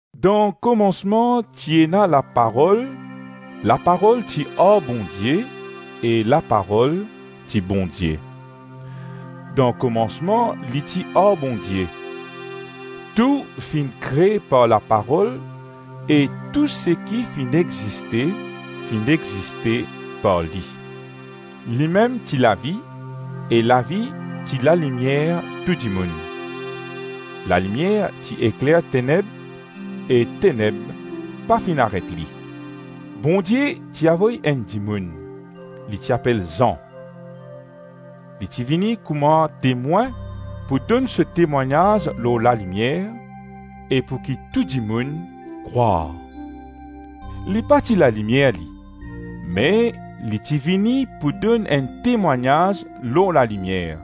Dan komansman ti ena Laparol, Laparol ti ar Bondie e Laparol ti Bondie. Dan komansman li ti ar Bondie. Tou finn kre par Laparol e tou seki finn existe, finn existe par li. Limem ti lavi e lavi ti lalimier tou dimoun. Lalimier ti ekler teneb, e teneb pa finn aret li. Bondie ti avoy enn dimoun; li ti apel Zan. Li ti vini kouma temwin pou donn so temwagnaz lor lalimier e pouki tou dimoun krwar. Li pa ti lalimier li, me li ti vini pou donn enn temwagnaz lor lalimier.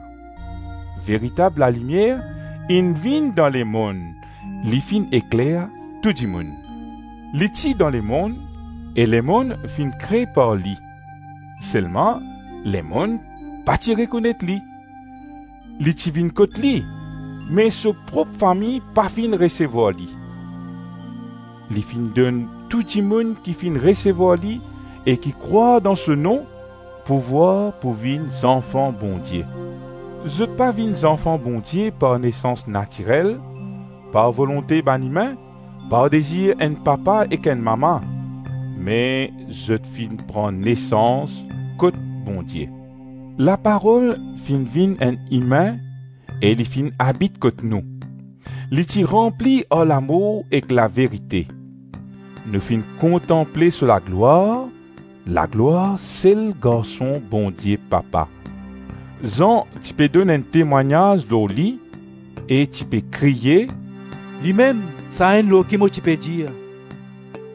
Veritab lalimier inn vinn dan lemonn, li finn ekler tou dimoun. Li ti dan lemonn e lemonn finn kre par li, selman lemonn pa ti rekonet li. Li ti vinn kot li me so prop fami pa finn resevwar li. Li finn donn tou dimoun ki finn resevwar li e ki krwar dan so nom pouvwar pou vinn zanfan Bondie. Zot pa vinn zanfan Bondie par nesans natirel, par volonte bann imin, par dezir enn papa ek enn mama, me zot finn pran nesans kot Bondie. Laparol finn vinn enn imin e li finn abit kot nou. Li ti ranpli ar lamour ek laverite. Nou finn kontanple so laglwar, laglwar sel Garson Bondie Papa. Zan ti pe donn enn temwagnaz lor li e ti pe kriye, “Limem Sa-Enn lor ki mo ti pe dir,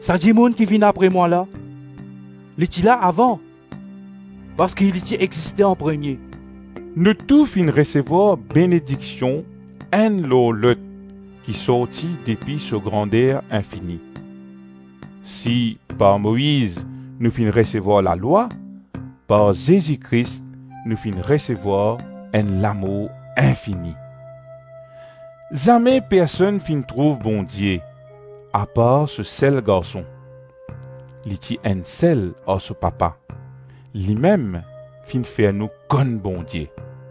‘Sa dimoun ki vinn apre mwa la, li ti la avan, parski li ti existe anpremie.’” Nou tou finn resevwar benediksion enn lor lot ki sorti depi so grander infini. Si par Moiz nou finn resevwar lalwa, par Zezi Kris nou finn resevwar enn lamour infini. Zame personn finn trouv Bondie apar so sel Garson. Li ti enn sel ar so Papa. Limem finn fer nou konn Bondie.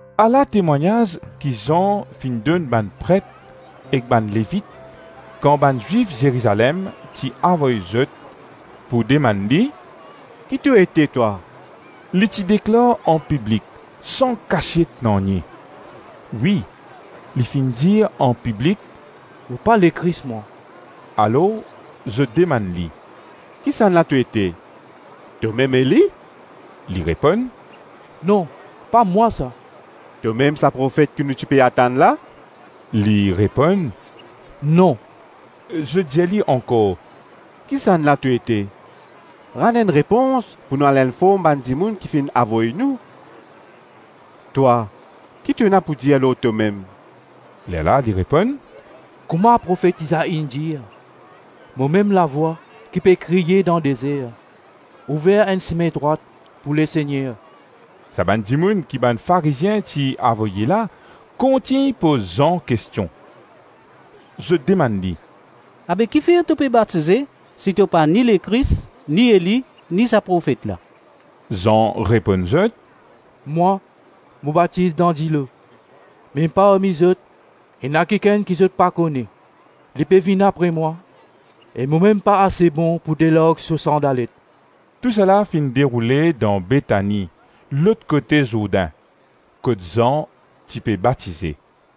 Ala temwagnaz ki Zan finn donn bann pret ek bann Levit, kan bann Zwif Zerizalem ti avoy zot pou demann li, “Ki to ete, twa?” Li ti deklar anpiblik san kasiet nanye; wi, li finn dir anpiblik, “Mo pa Lekris mwa.” Alors zot demann li, “Kisannla to ete? Tomem Eli?” Li reponn, “Non, pa mwa sa.” Tomem sa profet ki nou ti pe atann la? Li reponn, “Non.” Zot dir li ankor, “Kisannla to ete? Rann enn repons pou nou al inform bann dimoun ki finn avoy nou. Twa, ki to ena pou dir lor tomem?” Lerla li reponn, “Kouma profet Izai inn dir, ‘Momem lavwa ki pe kriye dan dezer, ouver enn sime drwat pou Lesegner.’” Sa bann dimoun ki bann Farizien ti avoye la kontign poz Zan kestion. Zot demann li, “Abe ki fer to pe batize si to pa ni Lekris, ni Eli, ni sa profet la?” Zan reponn zot, “Mwa, mo batiz dan dilo me parmi zot ena kikenn ki zot pa kone. Li pe vinn apre mwa, e mo mem pa ase bon pou delarg so sandalet.” Tousala finn deroule dan Betani lot kote Zourdin, kot Zan ti pe batize.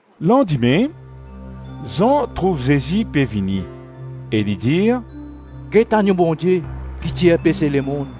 Landime, Zan trouv Zezi pe vini e li dir, “Get Annyo Bondie ki tir pese lemonn;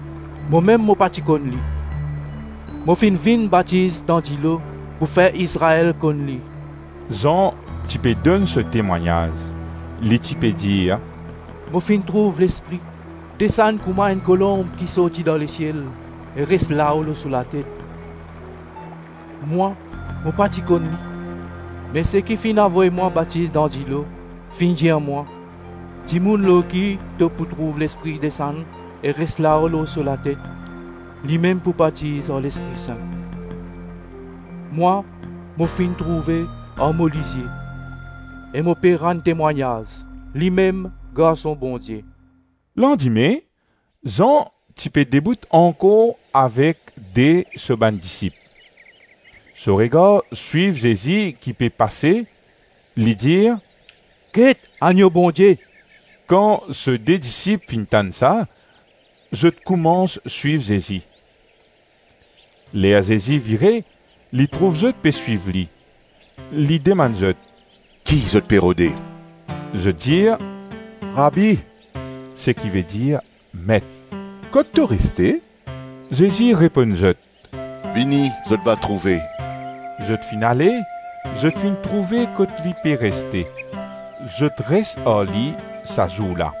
Momem mo pa ti konn li; mo finn vinn batiz dan dilo pou fer Izrael konn li.” Zan ti pe donn so temwagnaz, li ti pe dir, “Mo finn trouv Lespri desann kouma enn kolonb ki sorti dan lesiel e res lao lor so latet. Mwa, mo pa ti konn li, me seki finn avoy mwa batiz dan dilo, finn dir mwa, dimoun lor ki to pou trouv Lespri desann e res lao lor so latet, limem pou batiz ar Lespri Sin. Mwa mo finn trouve ar mo lizie e mo pe rann temwagnaz, limem Garson Bondie.” Landime Zan ti pe debout ankor avek de so bann disip. So regar swiv Zezi ki pe pase; li dir, “Get Annyo Bondie.” Kan so de disip finn tann sa, zot koumans swiv Zezi. Ler Zezi vire, li trouv zot pe swiv li; li demann zot: “Ki zot pe rode?” Zot dir, “Rabi, (seki vedir Met), kot to reste?” Zezi reponn zot, “Vini zot va trouve.” Zot finn ale, zot finn trouve kot li pe reste, zot res ar li sa zour la.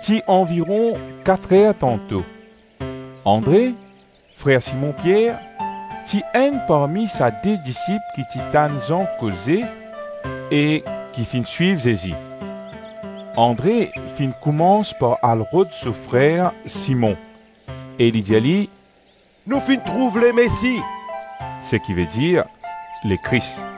Ti anviron kat-rer tanto. Andre, frer Simon Pier, ti enn parmi sa de disip ki ti tann Zan koze e ki finn swiv Zezi. Andre finn koumans par al rod so frer Simon, e li dir li, “Nou finn trouv Lemesi,” (seki vedir Lekris).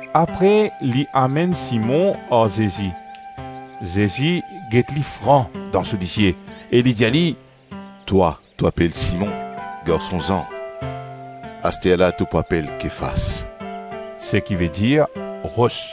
Apre li amenn Simon ar Zezi. Zezi get li fran dan so lizie e li dir li, “Twa, to apel Simon, garson Zan, asterla to pou apel Kefas,” (seki vedir ros).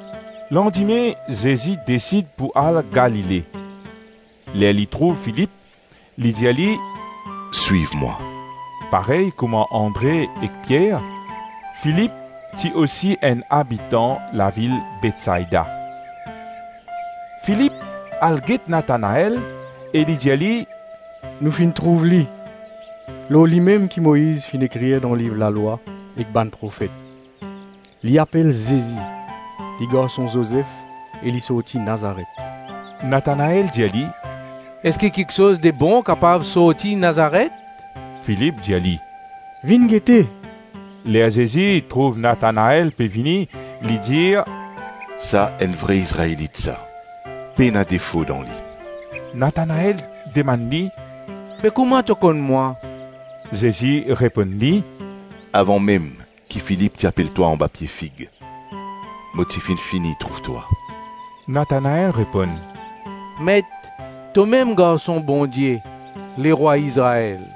Landime Zezi desid pou al Galile. Ler li trouv Filip, li dir li, “Swiv mwa.” Parey kouma Andre ek Pier, Filip ti osi enn abitan lavil Betsaida. Filip al get Natanael e li dir li, “Nou finn trouv li, lor limem ki Moiz finn ekrir dan liv lalwa ek bann profet. Li apel Zezi, li garson Zozef e li sorti Nazaret.” Natanael dir li, “Eski kiksoz de bon kapav sorti Nazaret?” Filip dir li, “Vinn gete.” Ler Zezi trouv Natanael pe vini, li dir, “Sa enn vre Izraelit, sa. Pena defo dan li.” Natanael demann li, “Be kouma to konn mwa?” Zezi reponn li, “Avan mem ki Filip ti apel twa anba pie fig, mo ti finn fini trouv twa.” Natanael reponn, “Met, tomem Garson Bondie, Lerwa Izrael.”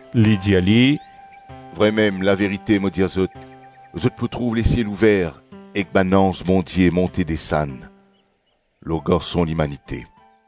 Li dir li, “Vremem, laverite mo dir zot, zot pou trouv lesiel ouver ek bann anz Bondie monte desann lor Garson Limanite.”